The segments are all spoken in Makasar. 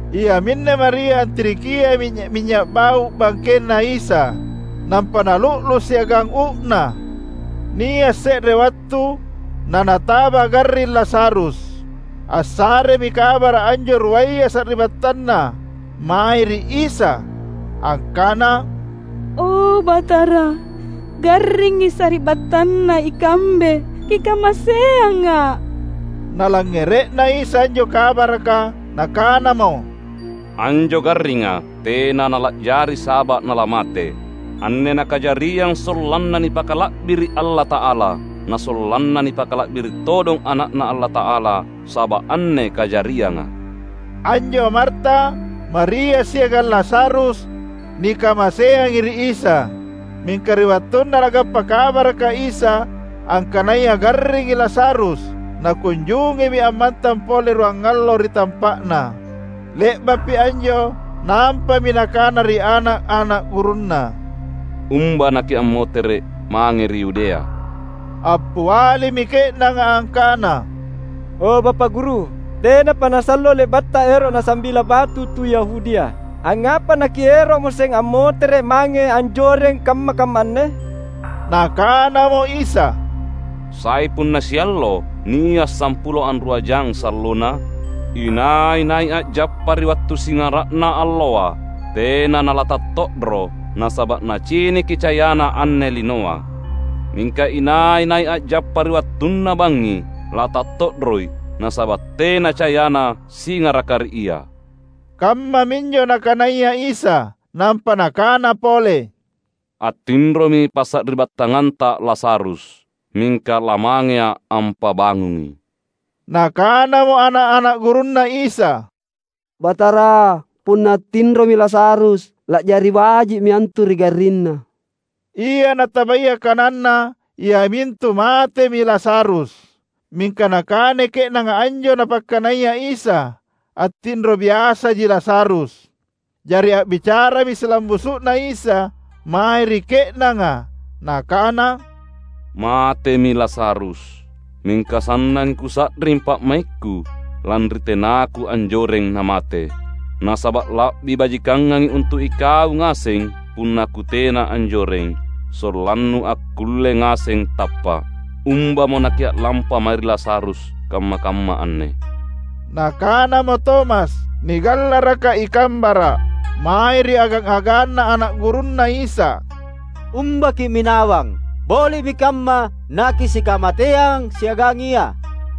Iaminne Maria antirikiai minynya’-minynya’ bau’ bangkenNa Isa, nampa nalu’lu’ siagang uu’na. Nia’ se’re wattu na nataba garring Lazarus. Assaremi kabara’ anjo ruaya sari’battanna mae ri Isa, angkana, "O Batara, garringi sari’battanna ikambe Kikamaseanga." Nalangngere’na Isa anjo kabaraka, Nakanamo, "Anjo garringa tena nala’jari saba’ nalamate. Anne nakajariang sollanna nipakala’biri’ Allata’ala, na sollanna nipakala’biri’ todong Ana’Na Allata’ala saba’ anne kajarianga." Anjo Marta, Maria siagang Lazarus, nikamaseangi ri Isa. Mingka ri wattunna Nagappa kabaraka Isa angkanaya garringi Lazarus, Nakunjungimi ammantang pole ruangallo ri tampa’Na. Le’ba’pi anjo nampami Nakana ri ana’-ana’ gurunNa, "Umba nakiammotere’ mange ri Yudea." Appialimi ke’nanga angkana, "O Bapa’ Guru, tenapa nasallo le’batTa ero’ nasambila batu tu Yahudia. Angngapa naKiero’moseng ammotere’ mange anjoreng kamma-kamma anne?" Nakanamo Isa, "Sai punna siallo nia’ sampulo anrua jang sallona? Inai-nai a’jappa ri wattu singara’na alloa, tena nalatatto’ro, nasaba’ naciniki cayana anne linoa. Mingka inai-nai a’jappa ri wattunna bangngi latatto’roi, nasaba’ tena cayana singaraka ri ia." Kammaminjo Nakanaya Isa. Nampa Nakana pole, "Attinromi passari’battanganta Lazarus; mingka lamangeA’ ampabangungi." Nakanamo ana’-ana’ gurunNa Isa, "Batara, punna attinromi Lazarus, la’jari baji’mi antu ri garrinna." Ia natabaya kananNa iamintu matemi Lazarus. Mingka nakanai ke’nanga anjo Napakkanaya Isa, attinro biasaji Lazarus. Jari a’bicarami silambusu’na Isa mae ri ke’nanga, Nakana, "Matemi Lazarus. Mingka sannangi Kusa’ring pa’maikKu lanri tenaKu anjoreng namate. Nasaba’ la’bi bajikangangi untu’ ikau ngaseng punna Kutena anjoreng, sollannu akkulle ngaseng tappa’. Umbamo nakia’lampa mae ri Lazarus kamma-kamma anne." Nakanamo Tomas, nigallaraka "I Kambara’" mae ri agang-aganna ana’ gurunNa Isa, "Umba kimminawang, boli’mi kamma nakisikamateang siagang Ia!"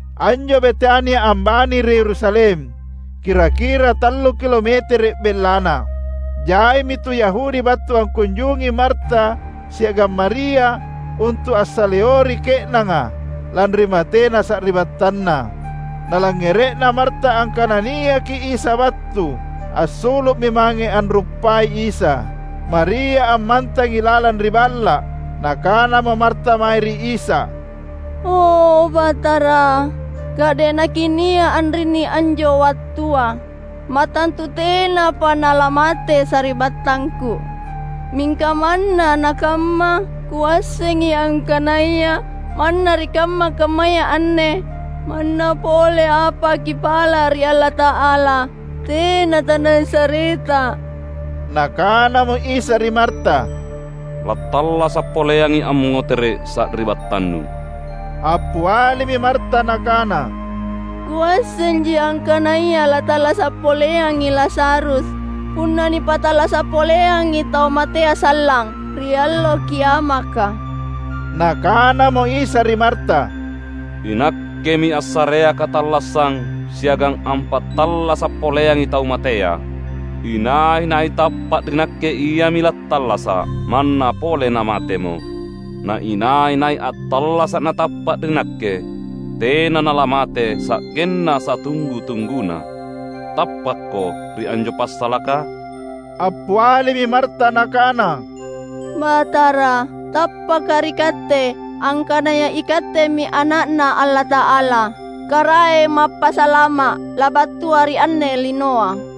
Anjo Betania ambani ri Yerusalem, kira-kira tallu kilometere’ bellana. Jaimi tu Yahudi battu angkunjungi Marta siagang Maria untu’ ansaleori ke’nanga lanri matena sari’battanna. Nalangngere’na Marta angkana niaki Isa battu, assulu’mi mange anruppai Isa; Maria ammantangi lalang ri balla’. Nakanamo Marta mae ri Isa, "O Batara, ka’de’ naKinia’ anrinni anjo wattua, mattantu tenapa nalamate sari’battangku. Mingka manna nakamma, kuassengi angkanaya manna ri kamma-kammaya anne manna pole apa Kipala’ ri Allata’ala tena taNasareTa." Nakanamo Isa ri Marta, "Lattallasa’ poleangi ammotere’ sari’battannu." Appialimi Marta nakana, "Kuassenji angkanaya lattallasa’ poleangi Lazarus punna nipattallasa’ poleangi tau matea sallang ri Allo Kiamaka." Nakanamo Isa ri Marta, "INakkemi assarea katallassang siagang ampattallasa’ poleangi tau matea. Inai-nai tappa’ ri Nakke iami lattallasa’, manna pole namatemo. Na inai-nai attallasa’ natappa’ ri Nakke, tena nalamate sa’genna satunggu-tungguna. Tappakko ri anjo passalaka?" Appialimi Marta nakana, "Batara, tappaka’ ri Katte angkanaya iKattemi Ana’Na Allata’ala, Karaeng Mappasalama’ labattua ri anne linoa."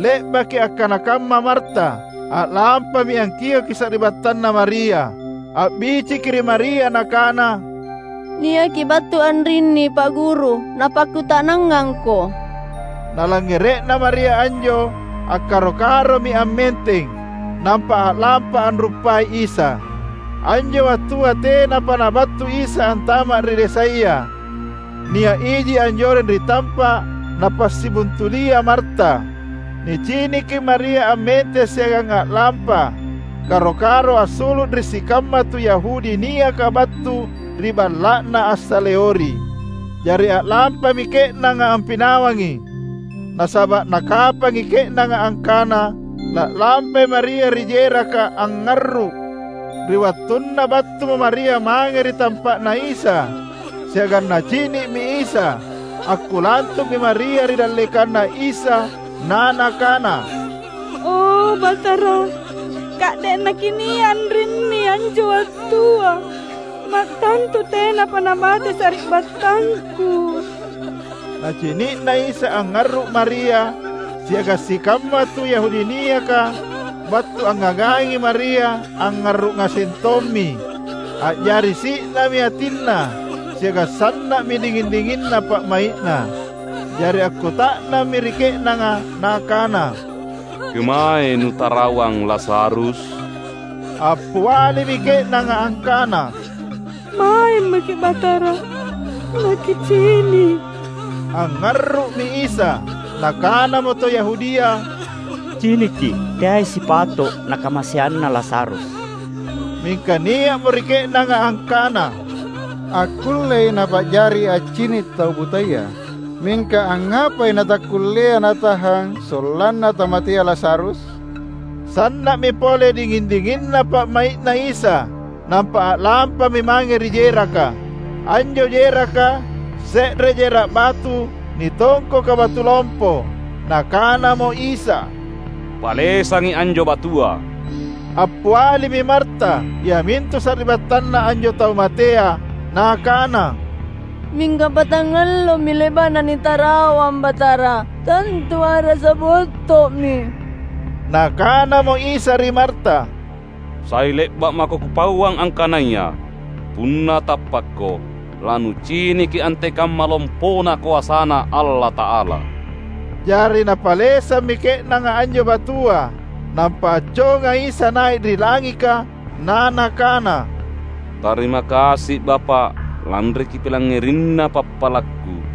Le’baki akkana kamma Marta, a’lampami angkioki sari’battanna Maria. A’biciki ri Maria nakana, "Niaki battu anrinni Pa’ Guru; Napakkuta’nangangko." Nalangngere’na Maria anjo, akkaro-karomi ammenteng, nampa a’lampa anruppai Isa. Anjo wattua tenapa Nabattu Isa antama’ ri desaya. Nia’ iji anjoreng ri tampa’ napassibuntulia Marta. Niciniki Maria ammenteng siagang a’lampa karo-karo assulu’ ri sikamma tu Yahudi niaka battu ri balla’na ansaleori. Jari a’lampami ke’nanga ampinawangi, nasaba’ nakapangi ke’nanga angkana la’lampai Maria ri jeraka angngarru’. Ri wattunna battumo Maria mange ri tampa’na Isa siagang nacini’mi Isa, akkulantu’mi Maria ri dallekanNa Isa na nakana, "O Batara, ka’de’ naKinia’ anrinni anjo wattua, mattantu tenapa namate sari’battangku." Nacini’na Isa angngarru’ Maria, siagang sikamma tu Yahudi niaka battu angngagangi Maria angngarru’ ngaseng tommi, a’jari si’nami atinNa siagang sanna’mi dinging-dinginna pa’mai’Na. Jari akkuta’nammi ri ke’nanga Nakana, "Kemaei nutarawang Lazarus?" Appialimi ke’nanga angkana, "MaemaKi’ Batara naKicini’." Angngarru’mi Isa. Nakanamo tu Yahudia, "Ciniki, teai sipato’ Nakamaseanna Lazarus!" Mingka nia’mo ri ke’nanga angkana, "Akkullei Napa’jari accini’ tau butaya, mingka angngapai natakkullea Natahang sollanna tamatea Lazarus?" Sanna’mi pole dinging-dinginna pa’mai’Na Isa, nampa a’lampami mange ri jeraka. Anjo jeraka, se’re jera’ batu nitongkoka batu lompo. Nakanamo Isa, "Palesangi anjo batua." Appialimi Marta, iamintu sari’battanna anjo tau matea, nakana, "Mingka patangallomi le’ba’na nitarawang, Batara. Tantu a’rasa botto’mi!" Nakanamo Isa ri Marta, "Sai le’ba’ mako Kupauang angkanaya: Punna tappakko, lanuciniki antekamma lompona koasaNa Allata’ala!" Jari napalesammi ke’nanga anjo batua. Nampa acconga Isa nai’ ri langika na nakana, "Tarima kasi’, Bapa’, lanri Kipilangngerinna pappalakKu.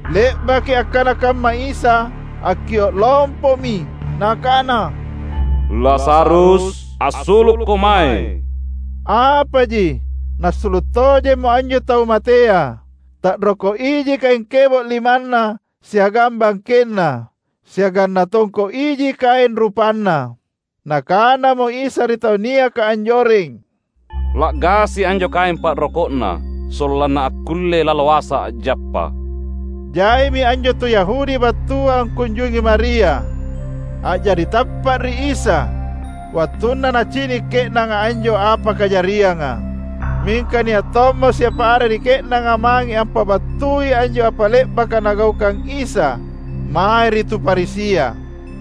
Le’baki akkana kamma Isa, akkio’ lompomi Nakana, "Lazarus, assulukko mae!" Apaji, nassulu’ tojemmo anjo tau matea. Ta’roko’ iji kaeng kebo’ limanna siagang bangkenna, siagang natongko’ iji kaeng rupanna. Nakanamo Isa ri tau niaka anjoreng, "La’gasi anjo kaeng pa’roko’na, sollanna akkulle laloasa a’jappa." Jaimi anjo tu Yahudi battua angkunjungi Maria, a’jari tappa’ ri Isa wattunna nacini’ ke’nanga anjo apa kajarianga. Mingka nia’ tommo siapa are ri ke’nanga mange ampabattui anjo apa le’baka Nagaukang Isa mae ri tu Farisia.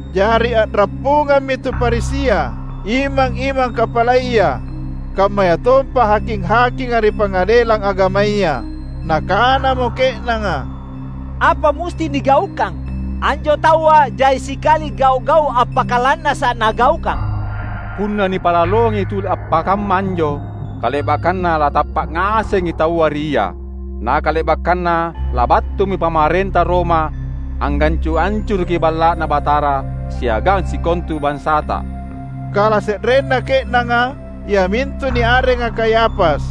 Jari a’rappungammi tu Farisia, imang-imang kapalaya, kammayatompa haking-hakinga ri Pangadelang Agamaya. Nakanamo ke’nanga, "Apa musti nigaukang? Anjo taua jai sikali gau’-gau’ appakalannasa’ Nagaukang! Punna nipa’laloangi tuli appakamma anjo, kale’bakkanna latappa’ ngasengi taua ri Ia. Na kale’bakkanna labattumi pamarenta Roma angngancu’-ancuruki Balla’Na Batara siagang sikontu bansata!" Kalase’renna ke’nanga, iamintu niarenga Kayafas,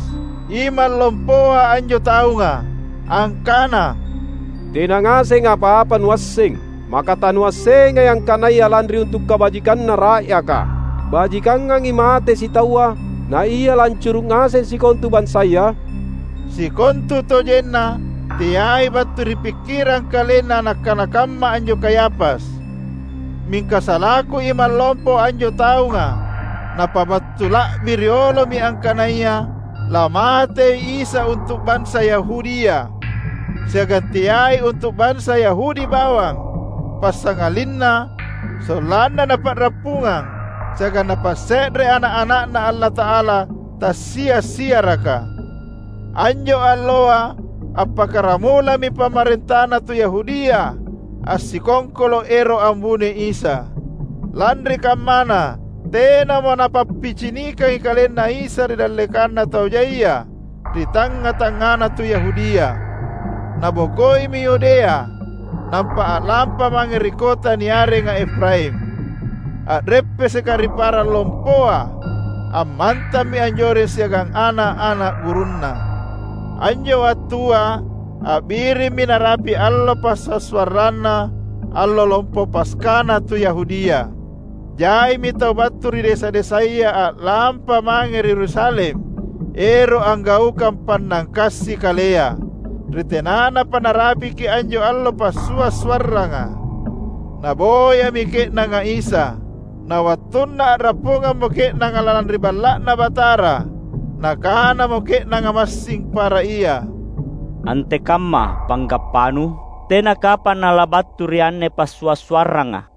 imang lompoa anjo taunga, angkana, "Tena ngaseng apa-apa nuasseng. Maka tanuassengai angkanaya lanri untu’ kabajikanna ra’yaka, bajikangangi mate sitaua, naia laancuru’ ngaseng sikontu bansaya?" Sikontutojenna, teai battu ri pikkirang kalenna nakkana kamma anjo Kayafas. Mingka salaku imang lompo anjo taunga napabattu la’bi riolomi angkanaya lamatei Isa untu’ bansa Yahudia. Siagang teai untu’ bansa Yahudi bawang, passangalinna sollanna napa’rappungang siagang napasse’re ana’-ana’Na Allata’ala tassia’-siaraka. Anjo alloa appakkaramulami pamarentana tu Yahudia assikongkolo’ ero’ ambunoi Isa. Lanri kammana, tenamo Napappicinikangi KalenNa Isa ri dallekanna tau jaia ri tangnga-tangngana tu Yahudia. Nabokoimi Yudea, nampa a’lampa mange ri kota niarenga Efraim, a’reppeseka ri parang lompoa. Ammantammi anjoreng siagang ana’-ana’ gurunNa. Anjo wattua a’birimmi narapi’ allo passua’-suarranna Allo Lompo Paskana tu Yahudia. Jaimi tau battu ri desa-desaya a’lampa mange ri Yerusalem ero’ anggaukang pannangkasi kalea, ri tenanapa narapiki anjo allo passua’-suarranga. Naboyami ke’nanga Isa. Na wattunna a’rappungammo ke’nanga lalang ri Balla’Na Batara, nakanamo ke’nanga massing para ia, "Antekamma panggappanu? Tena kapang Nalabattu ri anne passua’-suarranga."